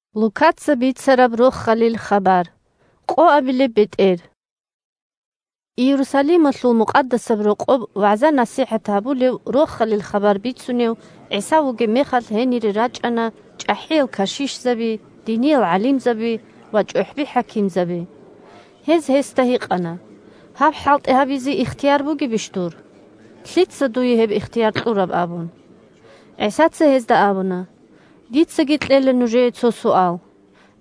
«Лъица дуе ихтияр кьураб?» Иерусалималъул Мукъадасаб Рокъоб вагӀза-насихӀат гьабулев, Рохалил хабар бицунев ГӀиса вугеб мехалъ, гьенире рачӀана чӀахӀиял кашишзаби, диниял гӀалимзаби ва чӀухӀби-хӀакимзаби. Гьез гьесда гьикъана: – Гьаб хӀалтӀи гьабизе ихтияр бугебищ дур? Лъица дуе гьеб ихтияр кьураб? – абун. ГӀисаца гьезда абуна: – Дицаги кьела нужее цо суал.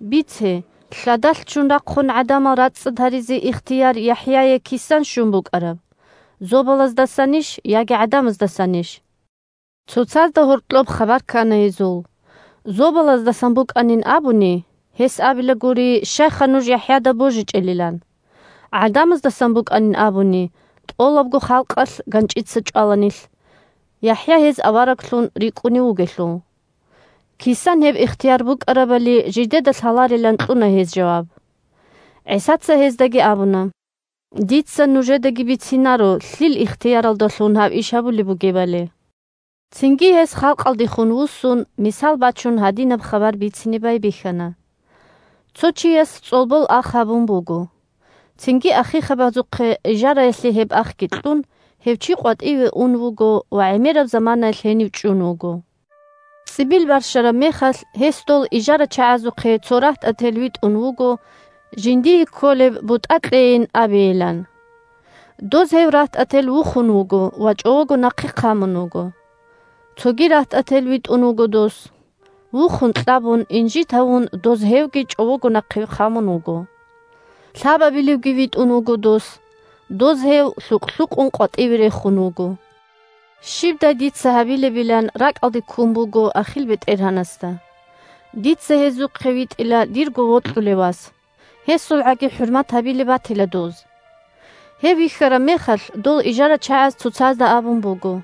Бице: лъадалъ ччун рахъун гӀадамал рацӀцӀад гьаризе ихтияр ЯхӀяе кисан щун букӀараб: зобалаздасанищ яги гӀадамаздасанищ? Цоцазда гьоркьоб хабар ккана гьезул. «Зобалаздасан букӀанин абуни, гьес абила гури, щайха нуж ЯхӀяда божичӀелилан. ГӀадамаздасан букӀанин абуни, тӀолабго халкъалъ ганчӀица чӀвала нилъ, ЯхӀя гьез авараглъун рикӀкӀунев вугелъул». Кисан гьеб ихтияр букӀарабали жидеда лъаларилан кьуна гьез жаваб. ГӀисаца гьездаги абуна: – Дица нужедаги бицинаро лъил ихтияралдалъун гьаб иш гьабулеб бугебали. Цинги гьес, халкъалдехун вуссун, мисал бачун, гьадинаб хабар бицине байбихьана: – Цо чияс цӀолбол ах гьабун буго. Цинги ахихъабазухъе ижараялъе гьеб ахги кьун, гьев чи къватӀиве ун вуго ва гӀемераб заманаялъ гьенив чӀун вуго. ЦӀибил барщараб мехалъ, гьес дол ижарачагӀазухъе цо рагьтӀател витӀун вуго жиндие кколеб бутӀа кьейин абейилан. Доз гьев рагьтӀател вухун вуго ва чӀового нахъе хъамун вуго. Цоги рагьтӀател витӀун вуго дос. Вухун-кьабун, инжит гьавун доз гьевги чӀового нахъе хъамун вуго. Лъабабилевги витӀун вуго дос. Доз гьев лъукъ-лъукъун къватӀиве рехун вуго. Щибдай дица гьабилебилан ракӀалде ккун буго ахил бетӀергьанасда. «Дица гьезухъе витӀила дирго вокьулев вас. ГьесулгӀаги хӀурмат гьабилеб батила доз». Гьев вихьараб мехалъ, дол ижарачагӀаз цоцазда абун буго: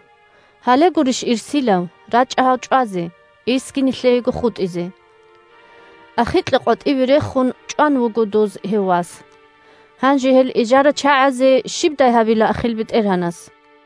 «Гьале гурищ ирсилав, рачӀа гьав чӀвазе, – ирсги нилъеего хутӀизе». Ахикьа къватӀивеги рехун, чӀван вуго доз гьев вас. Гьанже гьел ижарачагӀазе щибдай гьабила ахил бетӀергьанас?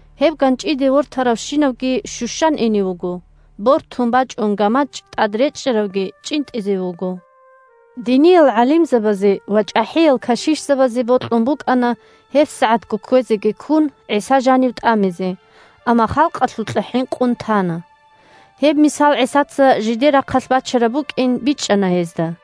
Гьеб ганчӀиде вортаравщинавги щущан ине вуго, бортун бачӀун гамачӀ тӀад речӀчӀаравги чӀинтӀизе вуго. Диниял гӀалимзабазе ва чӀахӀиял кашишзабазе бокьун букӀана, гьебсагӀатго кквезеги ккун, ГӀиса жанив тӀамизе, амма халкъалъукьа хӀинкъун тана. Гьеб мисал ГӀисаца жидер рахъалъ бачараб букӀин бичӀчӀана гьезда.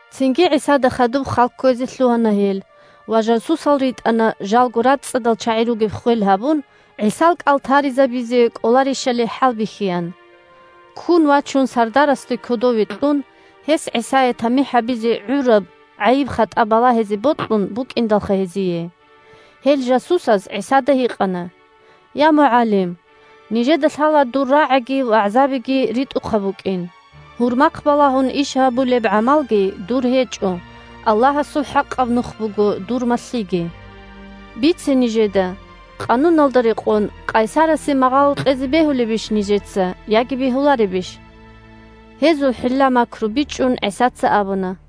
Цинги ГӀисада хадуб хал кквезе лъугьана гьел ва жасусал ритӀана, жалго рацӀцӀадал чагӀи ругеб ххвел гьабун, ГӀисал кӀал таризабизе кӀоларищали хӀалбихьеян. Ккун вачун сардарасда кодове кьун, гьес ГӀисае тамихӀ гьабизе гӀураб гӀайиб-хатӀа балагьизе бокьун букӀиндалха гьезие. Гьел жасусаз ГӀисада гьикъана: – Я, МугӀалим! Нижеда лъала дур рагӀиги вагӀзаги ритӀухъаб букӀин. Гьурмахъ балагьун иш гьабулеб гӀамалги дур гьечӀо, Аллагьасул хӀакъаб нух буго дур малъиги. Бице нижеда, къануналда рекъон, къайсарасе магъало кьезе бегьулебищ нижеца яги бегьуларебищ? Гьезул хӀилла-макру бичӀчӀун, ГӀисаца абуна: –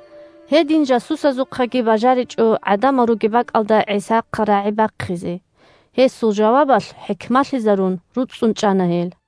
Гьедин жасусазухъаги бажаричӀо гӀадамал ругеб бакӀалда ГӀисахъа рагӀи бахъизе. Гьесул жавабалъ хӀикмалъизарун, руцӀцӀун чӀана гьел.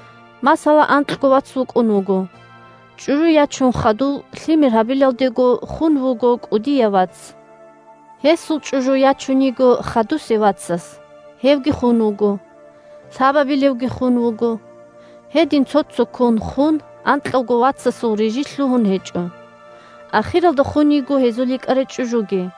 Масала, анкьго вац вукӀун вуго. ЧӀужу ячун хадув, лъимер гьабилалдего хун вуго кӀудияв вац. Гьесул чӀужу ячун йиго хадусев вацас, гьевги хун вуго. Лъабабилевги хун вуго. Гьедин цо-цоккун хун, анкьавго вацасул рижи лъугьун гьечӀо. Ахиралда хун йиго гьезул йикӀарай чӀужуги.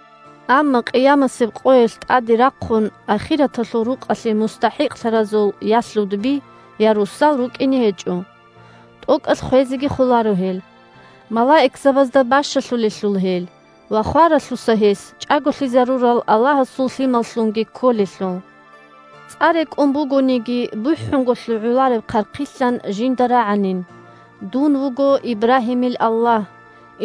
Амма къиямасеб къоялъ тӀаде рахъун ахираталъул рукъалъе мустахӀикълъаразул я лъудби, я росал рукӀине гьечӀо. ТӀокӀалъ хвезеги холаро гьел, малаикзабазда бащалъулелъул гьел ва хваралъуса гьес чӀаголъизарурал Аллагьасул лъималлъунги кколелъул. ЦӀа рекӀун бугониги, бухӀунго лъугӀулареб хъархъилъан жинда рагӀанин: «Дун вуго Ибрагьимил Аллагь,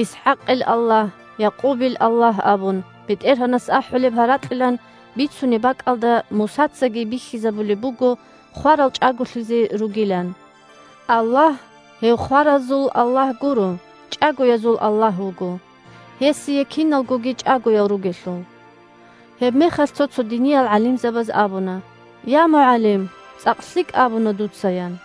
ИсхӀакъил Аллагь, Якъубил Аллагь!» – абун БетӀергьанас ахӀулеб гьаракьилан бицунеб бакӀалда, Мусацаги бихьизабулеб буго хварал чӀаголъизе ругилан. Аллагь – гьев хваразул Аллагь гуро, чӀагоязул Аллагь вуго, гьесие киналгоги чӀагоял ругелъул. Гьебмехалъ цо-цо диниял гӀалимзабаз абуна: – Я, МугӀалим! ЦӀакъ лъикӀ абуна дуца, – ян.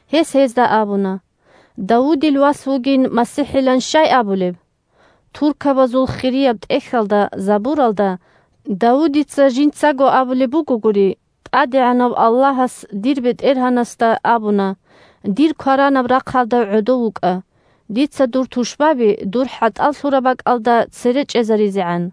Гьес гьезда абуна: – Давудил вас вугин МасихӀилан щай абулеб? Туркабазул Хирияб ТӀехьалда (Забуралда) Давудица жинцаго абулеб бугогури: «ТӀадегӀанав Аллагьас дир БетӀергьанасда абуна: „Дир кваранаб рахъалда гӀодов вукӀа, дица дур тушбаби дур хӀатӀал лъураб бакӀалда цере чӀезаризегӀан“».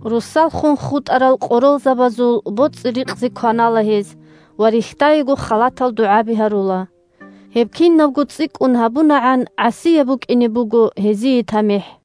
Росал хун хутӀарал къоролзабазул боцӀи-рикъзи кванала гьез ва рихьдаего халатал дугӀаби гьарула. Гьеб кинабго цӀикӀкӀун гьабунагӀан гӀасияб букӀине буго гьезие тамихӀ.